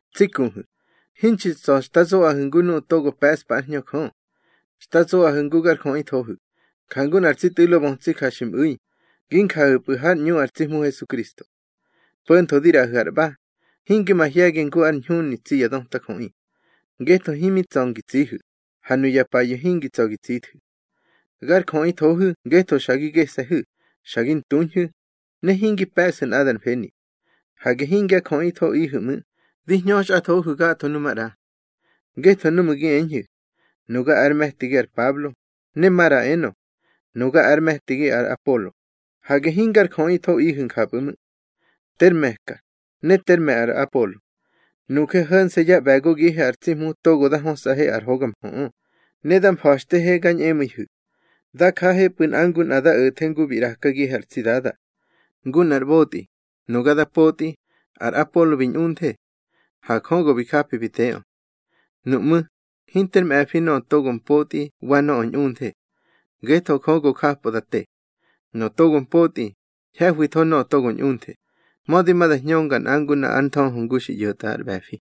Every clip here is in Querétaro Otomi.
Tsi kuhu̱, hinxi tsa̱ xta zoꞌahu̱ ngu nuꞌu̱ togo pe̱ꞌspa ár Hñö Jö. Xta zoꞌahu̱ ngu gar jöꞌithohu̱, jangu nꞌar tsi tꞌu̱lo bötsi ja xi mꞌu̱i; gi njahu̱pꞌu̱ hár ꞌñu ar tsi Hmu Hesukristo. Po̱ntho di ꞌraꞌahu̱ ar ꞌba, hinge mahye̱gi ngu ar ñhuni tsi ya döta jöꞌi. Ngetho himi tsa̱ ngi tsihu̱, ha nuya payu̱ hingi tsa̱ gi tsithu̱. Gar jöꞌithohu̱ ngetho xa gi gese̱hu̱, xa gi ntuñhu̱, ne hingi pe̱ꞌsu̱ nꞌadar mfeni. Hage hingya jöꞌithoꞌihu̱ ꞌmu̱, di hñöxꞌathohu̱ gatho nu maꞌra. Ngetho núꞌmu̱ gi eñhu̱: Nuga ár me̱tigi ar Pablo, ne maꞌra enö: Nuga ár me̱tigi ar Apolo; hage hingar jöꞌithoꞌihu̱ njapꞌu̱ ꞌmu̱. Ter me̱ka, ne ter me̱ ar Apolo. Nuje ho̱nse̱ yá ꞌbe̱gogihe ar tsi Hmu togo da hösꞌahe ár mhöꞌö, ne da mfa̱xtehe ga ñꞌemu̱ihu̱. Da jahepꞌu̱ nꞌa ngu nꞌa da o̱the ngu bi ꞌrakagihe ar tsi Dada. Ngu nꞌar ꞌbotꞌi, nuga da potꞌi, ar Apolo bi ꞌñunthe. Ha Jö go bi japi bi teꞌö. Nuꞌmú̱, hinter mꞌe̱fi nöꞌö togo mpotꞌi wa nöꞌö ꞌñunthe, ngetho Jö go japꞌö da te. Nöꞌö togo mpotꞌi, ñhe̱hwitho nöꞌö togo ꞌñunthe, mödi ma da hñönga nꞌa ngu nꞌa ár nthöhö ngu xi ꞌyo̱tꞌa ar ꞌbe̱fi.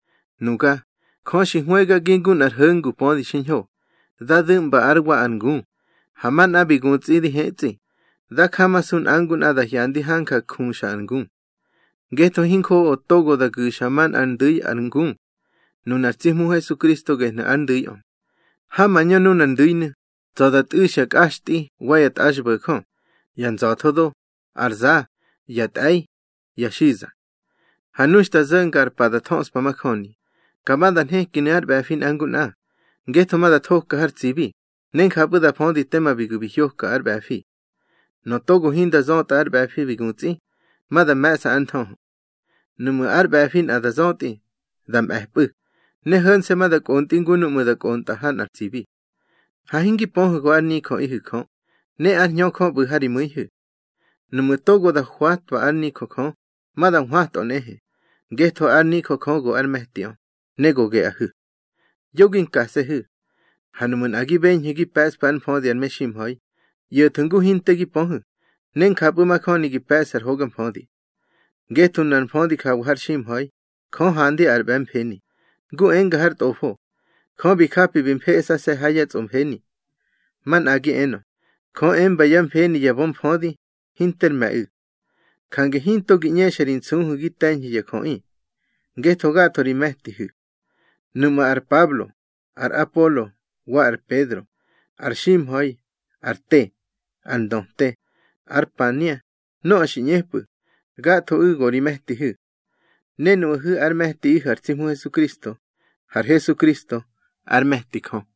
Nuga, Jö xi hwëgagi ngu nꞌar ho̱ngu pödi xiñho, da du̱ꞌmba ár wa ar ngu, ha manꞌa bi gutsꞌi di hetsꞌi. Dá jamasu nꞌa ngu nꞌa da hyandi hanja juxa ar ngu. Ngetho hinjoꞌo togo da gu̱xa manꞌár ndu̱i ar ngu. Nunar tsi Hmu Hesukristo gehnu̱ ar ndu̱iꞌö. Ha mañö nunar ndu̱inu̱, tsa̱ da tꞌu̱xya kꞌaxtꞌi wa ya tꞌaxbo̱jö, ya nza̱tho do, ar za, ya tꞌe̱i, ya xiza. Ha nu xta zo̱nga ar pa da thöꞌspa majöni, ka ma da nhekinu̱ ár ꞌbe̱fi nꞌa ngu nꞌa; ngetho ma da thoka har tsibi, ne njapꞌu̱ da födi tema bi gu̱ bi hyoka ár ꞌbe̱fi. Nöꞌö togo hinda zötꞌa ár ꞌbe̱fi bi gutsꞌi, ma da me̱ꞌsa ár nthöhö. Nuꞌmu̱ ár ꞌbe̱fi nꞌa da zötꞌi, da mꞌe̱pꞌu̱, ne ho̱nse̱ ma da kꞌontꞌi ngu núꞌmu̱ da kꞌontꞌa ha nꞌar tsibi. Ha hingi pöhu̱ go ár nijöꞌihu̱ Jö, ne ár Hñö Jö ꞌbu̱ ha ri mu̱ihu̱. Nuꞌmu̱ togo da hwatwa ár nijö Jö, ma da nhwatꞌö nꞌehe, ngetho ár nijö Jö go ár me̱tiꞌö, ne go geꞌahu̱. Yo gi nkase̱hu̱. Ha nuꞌmu̱ nꞌa gi beñhu̱ gi pe̱ꞌsfu̱ ár mfödi ar meximha̱i, ꞌyo̱thu̱ ngu hinte gi pöhu̱, ne njapꞌu̱ majöni gi pe̱ꞌsu̱ ar hoga mfödi. Ngetho nunar mfödi jawa har ximha̱i, Jö handi ar ꞌbe̱mfeni, ngu enga har Tꞌofo: Jö bi japi bi mfeꞌsase̱ ha yá tsꞌomfeni. Manꞌagi enö: Jö emba yá mfeni ya bömfödi, hinter me̱ꞌu̱. Jange hinto gi ꞌñexa ri nsuhu̱ gi te̱ñhu̱ ya jöꞌi, ngetho gatho ri me̱tihu̱. Nuꞌmu̱ ar Pablo, ar Apolo, wa ar Pedro, ar ximha̱i, ar te, ar ndöte, ár pania, nöꞌö xi ꞌñepꞌu̱, gathoꞌu̱ go ri me̱tihu̱. Ne nuꞌahu̱ ár me̱tiꞌihu̱ ar tsi Hmu Hesukristo, har Hesukristo ár me̱ti Jö.